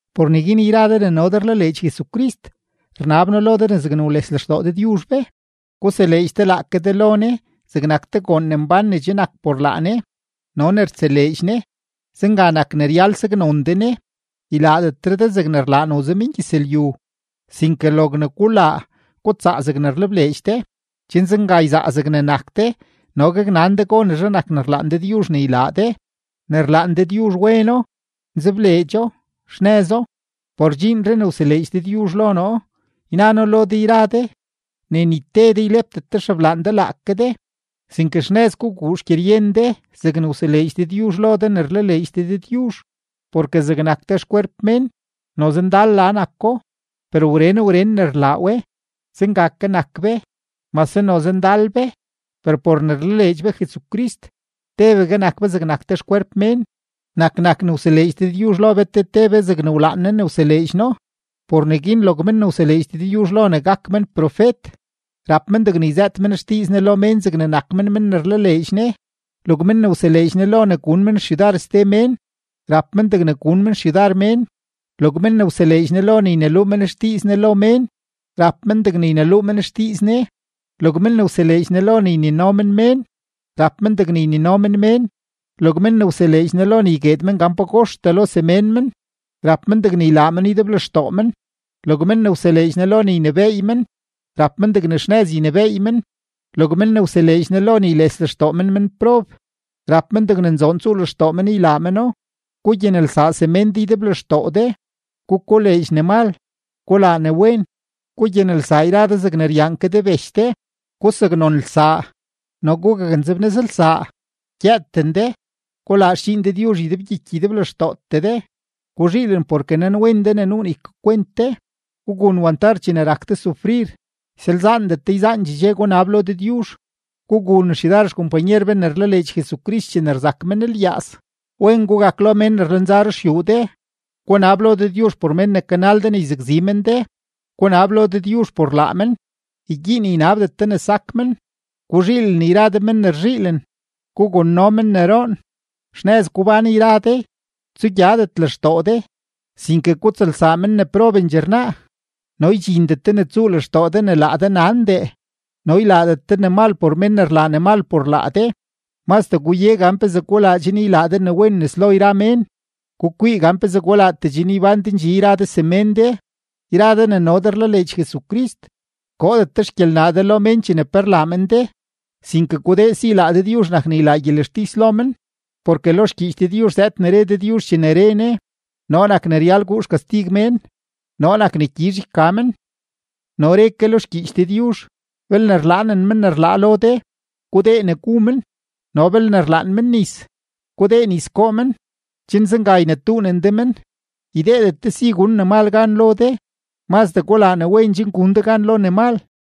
Por neguin yra de ne no de rlaleedx Jesucrist, rnab noo lo de ne zegne wles lextoo Dëdyuzh be, guseleedx de laake de lo Ne zegnak te goon ne mbán ne che nak por laa Ne no ne rtseleedx Ne; zenga nak ne ryal saknon de Ne. Ylaadetre de zegne rlaa noze mengyëzlyu, sinke logne gulaa, gutsaa zegne rlebleedx de, chen zenga yzaa zegne nak de, no gaknan de gonezhe nak ne rlaan Dëdyuzh ne ylaa de; ne rlaan Dëdyuzh weno, nzebleedxo, xnëzo. Por dxiinree ne wseleedx Dëdyuzh lo noo, yna noo lo de yra de, ne ni te de ylepdet de xeblaan de laake de, sinke xnëz guguu xgyeryen de zegne wseleedx Dëdyuzh lo de ne rlaleedx de Dëdyuzh. Porke zegnak te xkwerp mén, noze ndal la nako, per wren wren ne rlaa we, zenga ke nak be, mase noze ndal be, per por ne rlaleedx be Jesucrist, tebegue nak be zegnak te xkwerp mén. Nak nak ne wseleedx Dëdyuzh lo be te te be zegne wlaan Ne ne wseleedx No. Por neguin log men ne wseleedx Dëdyuzh lo ne gak men profet, rap men degne yzëët men xdiiz Ne lo mén zegne nak men men ne rlaleedx Ne. Log men ne wseleedx Ne lo ne gun men xyudar ste mén, rap men degne gun men xyudar mén. Log men ne wseleedx Ne lo ne yneluu men xdiiz Ne lo mén, rap men degne yneluu men xdiiz Ne. Log men ne wseleedx Ne lo ne ynino men mén, rap men degne ynino men mén. Log men ne wseleedx Ne lo ne ygueed men gan pagoxtee lo semén men, rap men degne ylaa meno ydeblextoo men. Log men ne wseleedx Ne lo ne ynebééy men, rap men degne xnëz ynebééy men. Log men ne wseleedx Ne lo ne yles lextoo men menprob, rap men degne nzoon tsuu lextoo men ylaa meno. Gugyanelsaa semén de ydeblextoo de. Gukoleedx ne mal; gulaa ne wen. Gugyanelsaa yra de zegne ryaan ke de bech de; gusaknonelsaa no gugaknzebnëzlsaa. Gyëëten de, gulaa xdxiin Dëdyuzh ydebgyiky ydeblextootee de. Guzhiilen porke nanwen de ne nuu ne ykakwent de; gugun wantar chene rak de sufrir; ysalzaandet de yzaandxee dxe gunab lo Dëdyuzh. Gugun xyudar xkompanyer be ne rlaleedx Jesucrist chene rzak men lyaaz; wen gugak lo mén ne rlenza ruxyuu de. Gunab lo Dëdyuzh por men ne kanal de ne yzakzi men de, gunab lo Dëdyuzh por laa men, ygyiin ynabdet de ne sak men. Guzhiilen yra de men ne rzhiilen; gugonno men ne roon. Xnëz gubán yra de; tsugyadet lextoo de, sinke gutsëlsaa men ne probendxee rnaa, no ydxindet de ne tsuu lextoo de ne laa de nandee. No ylaadet de ne mal por mén ne rlaa ne mal por laa de; mazdee guye gan pezee gulaa chen ylaa de ne wen nes lo yra mén. Gukwii gan pezee gulaatee chen ybán de ndxi yra de semén de. Yra de ne no de rlaleedx Jesucrist, koodet xgyelnaa de lo mén chene pe rlaa men de, sinke gudee si laa Dëdyuzh nak ne ylaa gyelextis lo men; porke lo xgyiich Dëdyuzh zëëd ne re Dëdyuzh chene re Ne: “Noo nak ne ryal guu xkastig mén; noo nak ne gyizh yka men.” No re ke lo xgyiich Dëdyuzh: “Belne rlaanen men ne rlaa lo de, gudee ne gu men, no belne rlaan men nis, gudee nis goo men; chen zenga ynetuunen de men.” Ydeedet de si gun ne mal gan lo de; mazdee gulaa ne wen chen gun de gan lo ne mal.